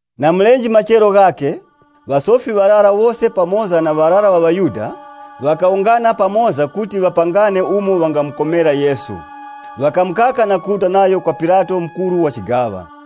Na mulenje machero ghakhe, ŵasofi ŵarara wose pamoza na ŵarara ŵa ŵaYuda, ŵakawungana pamoza kuti ŵapangane umo ŵangamukomera Yesu. Ŵakamukaka na kuruta nayo kwa Pilato mukuru wa chigaŵa.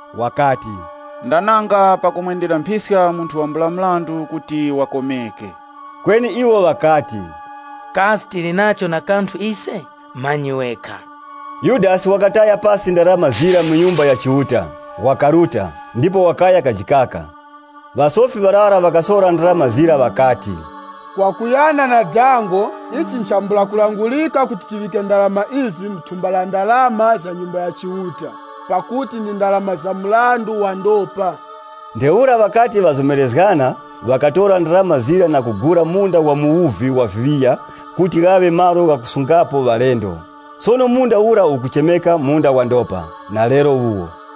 Wakati, “Ndananga pakumwendera mphiska munthu wambula mrandu kuti wakomeke.” Kweni iwo ŵakati, “Kasi tili nacho na kanthu ise? Manyi wekha.” Yudasi wakataya pasi ndarama zira mu Nyumba ya Chiuta, wakaruta, ndipo wakaya kajikaka. Ŵasofi ŵarara ŵakasora ndarama zira ŵakati, “Kwakuyana na dango, ichi nchambula kulangurika kuti tiŵike ndarama izi mu thumba la ndarama za Nyumba ya Chiuta, pakuti ndi ndarama za mrandu wa ndopa.” Ntheura ŵakati ŵazomerezgana ŵakatora ndarama zira na kugula munda wa muwuvi wa viŵiya kuti ghaŵe malo ghakusungapo ŵalendo. Sono munda ura ukuchemeka, “Munda wa Ndopa” na lero wuwo.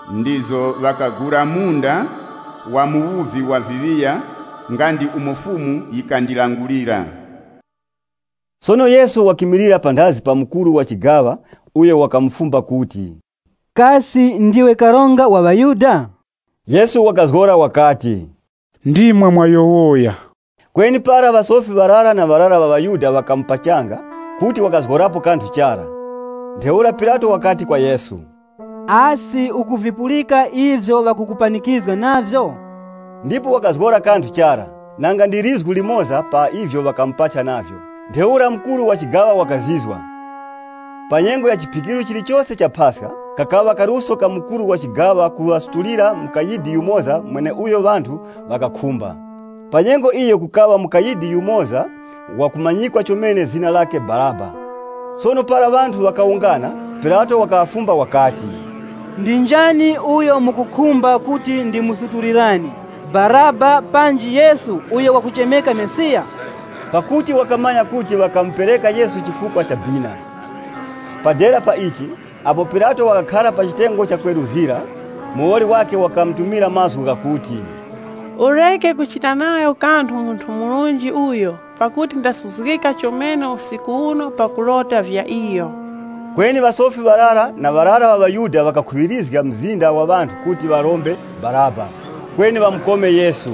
ndipo ŵakagura munda wa muwuvi wa viŵiya nga ndi umo Fumu yikandilangulira.” Sono Yesu wakimilira panthazi pa mukuru wa chigaŵa uyo wakamufumba kuti, “Kasi ndiwe karonga wa ŵaYuda?” Yesu wakazgora wakati, “Ndimwe mwayowoya.” Kweni para ŵasofi ŵarara na ŵarara ŵa ŵaYuda ŵakamupachanga, kuti wakazgorapo kanthu chara. Ntheura Pilato wakati kwa Yesu, “Asi ukuvipulika ivyo ŵakukupanikizga navyo?” Ndipo wakazgora kanthu chara, nanga ndi lizgu limoza pa ivyo ŵakamupachanga navyo. Ntheura mukuru wa chigaŵa wakazizwa. Pa nyengo ya Chiphikiro chilichose cha Paska, kakaŵa kaluso ka mukuru wa chigaŵa kuŵasutulira mukayidi yumoza mweneuyo ŵanthu ŵakakhumba. Pa nyengo iyo kukaŵa mukayidi yumoza wakumanyikwa chomene zina lakhe Baraba. Sono para ŵanthu ŵakawungana, Pilato wakaŵafumba wakati, “Ndi njani uyo mukukhumba kuti ndimusutulirani, Baraba panji Yesu uyo wakuchemeka Mesiya?” Pakuti wakamanya kuti ŵakamupereka Yesu chifukwa cha bina. Pa dera pa ichi, apo Pilato wakakhara pa chitengo cha kweruzgira, muwoli wakhe wakamutumira mazgu ghakuti, “Ureke kuchita nayo kanthu munthu murunji uyo pakuti ndasuzgika chomene usiku uno pakulota vya iyo.” Kweni ŵasofi ŵarara na ŵarara ŵa ŵaYuda ŵakakhuŵirizga mzinda wa ŵanthu kuti ŵarombe Baraba, kweni ŵamukome Yesu.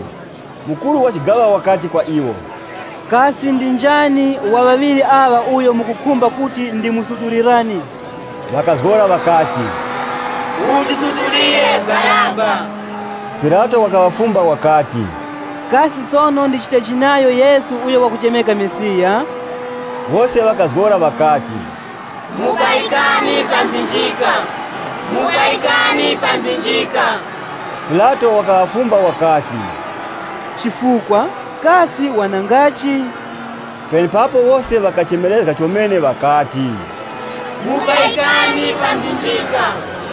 Mkuru wa chigaŵa wakati kwa iwo, “Kasi ndi njani wa ŵaŵiri aŵa uyo mukukhumba kuti ndimusutulirani?” Ŵakazgora ŵakati, “Mutisutulire Baraba!” Pilato wakaŵafumba wakati, “Kasi sono ndichitechi nayo Yesu uyo wakuchemeka Mesiya?” Wose ŵakazgora ŵakati, “Mupayikani pa mphinjika!” Pilato wakaŵafumba, “Chifukwa? Kasi wanangachi?” Penepapo wose ŵakachemerezga chomene ŵakati, “Mupayikani pa mphinjika!”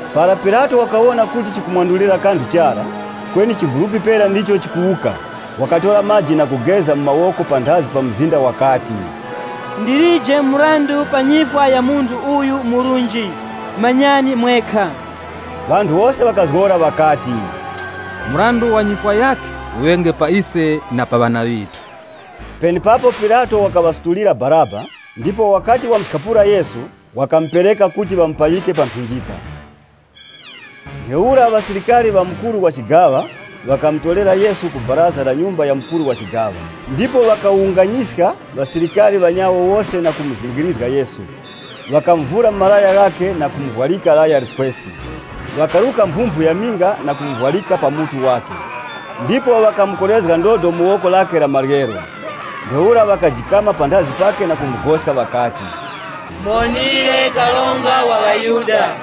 Para Pilato wakawona kuti chikumwandulirapo kanthu chara, kweni chivulupi pera ndicho chikuwuka, wakatora maji na kugeza mu mawoko panthazi pa mzinda wakati, “Ndilije mrandu pa nyifwa ya munthu uyu murunji, manyani mwekha.” Ŵanthu wose ŵakazgora ŵakati, “Mrandu wa nyifwa yakhe uŵenge pa ise na pa ŵana ŵithu.” Penepapo Pilato wakaŵasutulira Baraba, ndipo wakati wamuthyapula Yesu, wakamupereka kuti ŵamupayike pa mphinjika. Ntheura ŵasilikari ŵa mukuru wa chigaŵa ŵakamutorera Yesu ku baraza la nyumba ya mukuru wa chigaŵa, ndipo ŵakawunganyiska ŵasilikari ŵanyawo wose na kumuzingirizga Yesu Ŵakamuvura malaya ghakhe na kumuvwarika laya liswesi. Ŵakaruka mphumphu ya minga na kumuvwarika pa mutu wakhe, ndipo ŵakamukorezga ndodo mu woko lakhe la maryero. Ntheura ŵakajikama panthazi pakhe na kumugoska ŵakati, “Muwonire Karonga wa ŵaYuda!”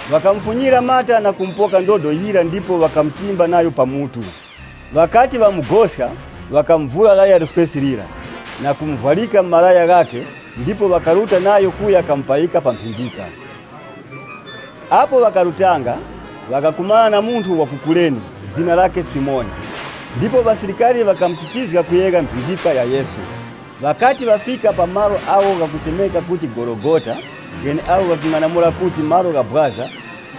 Ŵakamufunyira mata na kumupoka ndodo yira ndipo ŵakamutimba nayo pa mutu. Ŵakati ŵamugoska ŵakamuvura laya liswesi lira na kumuvwarika malaya ghakhe ndipo ŵakaruta nayo kuya kamupayika pa mphinjika. Apo ŵakarutanga, ŵakakumana na munthu wa ku Kurene zina lakhe Simoni. Ndipo ŵasilikari ŵakamuchichizga kuyegha mphinjika ya Yesu. Ŵakati ŵafika pa malo agho ghakuchemeka kuti Gologota gheneagho ghakung'anamula kuti, “Malo gha Bwaza,”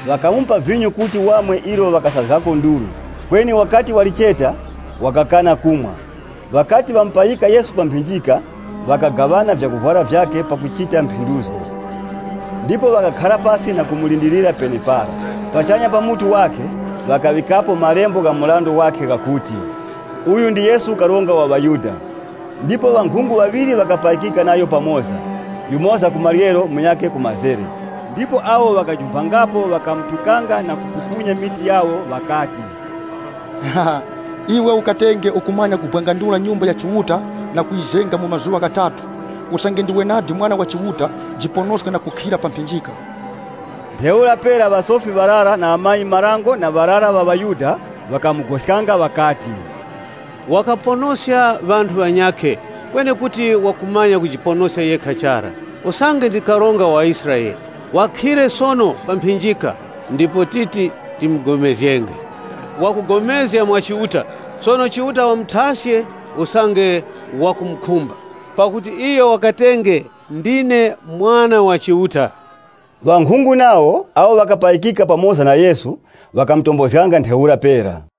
ŵakamupa vinyo kuti wamwe ilo ŵakasazgako nduru. Kweni wakati walicheta, wakakana kumwa. Ŵakati ŵamupayika Yesu pa mphinjika, ŵakagaŵana vyakuvwara vyakhe pakuchita mphenduzgo. Ndipo ŵakakhara pasi na kumulindirira penepara. Pachanya pa mutu wakhe, ŵakaŵikapo malembo gha mrandu wakhe ghakuti, “Uyu ndi Yesu Karonga wa ŵaYuda.” Ndipo ŵankhungu ŵaŵiri ŵakapayikika nayo pamoza, yumoza ku maryero, munyakhe ku la mazere. Ndipo awo ŵakajumphangapo ŵakamutukanga na kupukunya mitu yawo, ŵakati, “Iwe ukatenge ukumanya kubwangandula Nyumba ya Chiuta na kuyizenga mu mazuŵa ghatatu, usange ndiwe nadi Mwana wa Chiuta, jiponoska na kukhira pa mphinjika.” Ntheura pera ŵasofi ŵarara na ŵamanyi-marango na ŵarara ŵa ŵaYuda ŵakamugoskanga ŵakati, “Wakaponoska ŵanthu ŵanyakhe, kweni kuti wakumanya kujiponoska yekha chara. Usange ndi karonga wa Israele, wakhire sono pa mphinjika ndipo titi tipulikane nayo. Wakugomezga mwa Chiuta, sono Chiuta wamuthaske, usange wakumukhumba. Pakuti iyo wakatenge, ‘Ndine Mwana wa Chiuta.’” Ŵankhungu nawo, awo ŵakapayikika pamoza na Yesu, ŵakamutombozganga ntheura pera.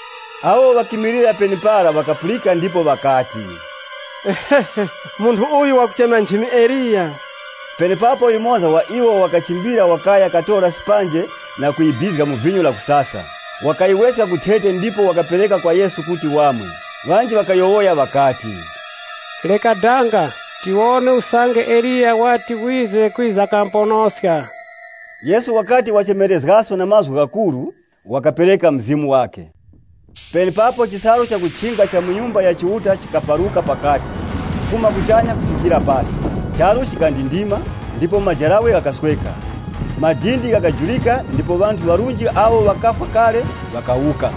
Awo ŵakimilira penepara ŵakapulika ndipo ŵakati, “Munthu uyu wakuchema nchimi Eliya.” Penepapo yumoza wa iwo wakachimbira wakaya katora sipanje na kuyibizga mu vinyo lakusasa, wakayiweska ku thete ndipo wakapereka kwa Yesu kuti wamwe. Ŵanji ŵakayowoya ŵakati, “Reka danga, tiwone usange Eliya wati wize kwiza kamuponoska.” Yesu wakati wachemerezgaso na mazgu ghakuru, wakapereka mzimu wakhe. Penepapo chisalu chakuchinga cha mu Nyumba ya Chiuta chikaparuka pakati, kufuma kuchanya kufikira pasi. Charu chikandindima, ndipo majarawe ghakasweka. Madindi ghakajurika ndipo ŵanthu ŵarunji awo ŵakafwa kale, ŵakawuka.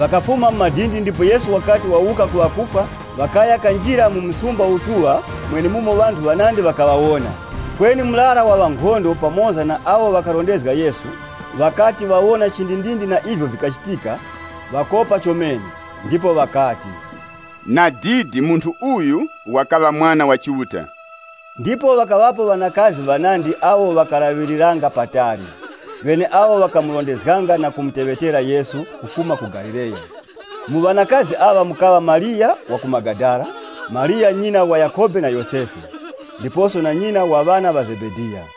Ŵakafuma mu madindi ndipo Yesu wakati wawuka ku ŵakufwa, ŵakaya kanjira mu msumba wakupatulika mwenemumo ŵanthu ŵanandi ŵakaŵawona. Kweni murara wa ŵankhondo pamoza na awo ŵakalondanga Yesu, ŵakati ŵawona chindindindi na ivyo vikachitika, ŵakopa chomene. Ndipo ŵakati, “Nadidi, Munthu uyu wakaŵa Mwana wa Chiuta!” Ndipo ŵakaŵapo ŵanakazi ŵanandi awo ŵakalaŵiriranga patali, ŵeneawo ŵakamurondezganga na kumuteŵetera Yesu kufuma ku Galileya. Mu ŵanakazi aŵa mukaŵa Mariya wa ku Magadala, Mariya nyina wa Yakhobe na Yosefe, ndiposo na nyina wa ŵana ŵa Zebediya.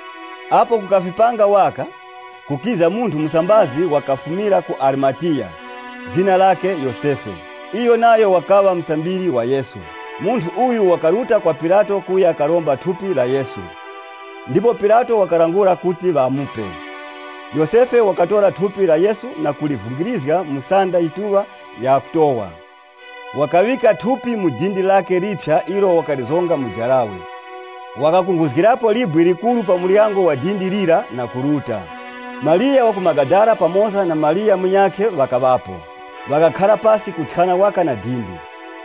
Apo kukafipanga waka, kukiza munthu musambazi wakafumira ku Arimatiya, zina lakhe Yosefe. Iyo nayo wakaŵa musambiri wa Yesu. Munthu uyu wakaruta kwa Pilato kuya karomba thupi la Yesu. Ndipo Pilato wakalangula kuti ŵamupe. Yosefe wakatora thupi la Yesu na kulivungirizga mu sanda yituŵa ya kutowa. Wakaŵika thupi mu dindi lakhe liphya ilo wakazonga mu jarawe. Wakakunkhuzgirapo libwe likuru pa muryango wa dindi lira na kuruta. Mariya wa ku Magadala pamoza na Mariya munyakhe ŵakaŵapo, ŵakakhara pasi kuthyana waka na dindi.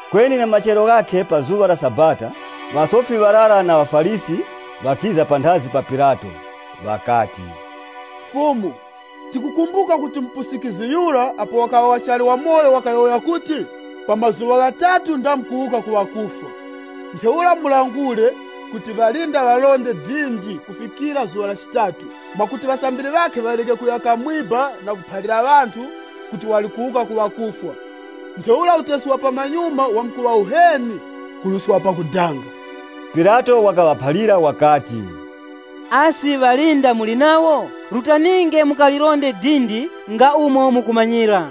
Kweni na machero ghakhe pa zuŵa la Sabata ŵasofi ŵarara na ŵaFarisi, ŵakiza panthazi pa Pilato. Ŵakati, “Fumu, tikukumbuka kuti mupusikizgi yura apo wakaŵa wachali wamoyo wakayowoya kuti, ‘Pa mazuŵa ghatatu ndamkuwuka ku ŵakufwa.’ Ntheura mulangure kuti ŵalinda ŵaronde dindi kufikira zuŵa la chitatu, mwakuti ŵasambiri ŵakhe ŵareke kuya kamwiba na kuphalira ŵanthu kuti wali kuwuka ku ŵakufwa. Ntheura utesi wa pamanyuma wamkuŵa uheni kuruska wa pakudanga.” Pilato wakaŵaphalira wakati, “Asi ŵalinda muli nawo, rutaninge mukalilinde dindi nga umo mukumanyira.”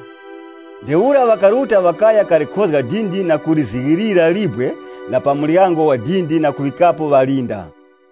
Ntheura ŵakaruta ŵakaya kalikhozga dindi na kuzighilira libwe la pa muryango wa dindi na kuŵikapo ŵalinda.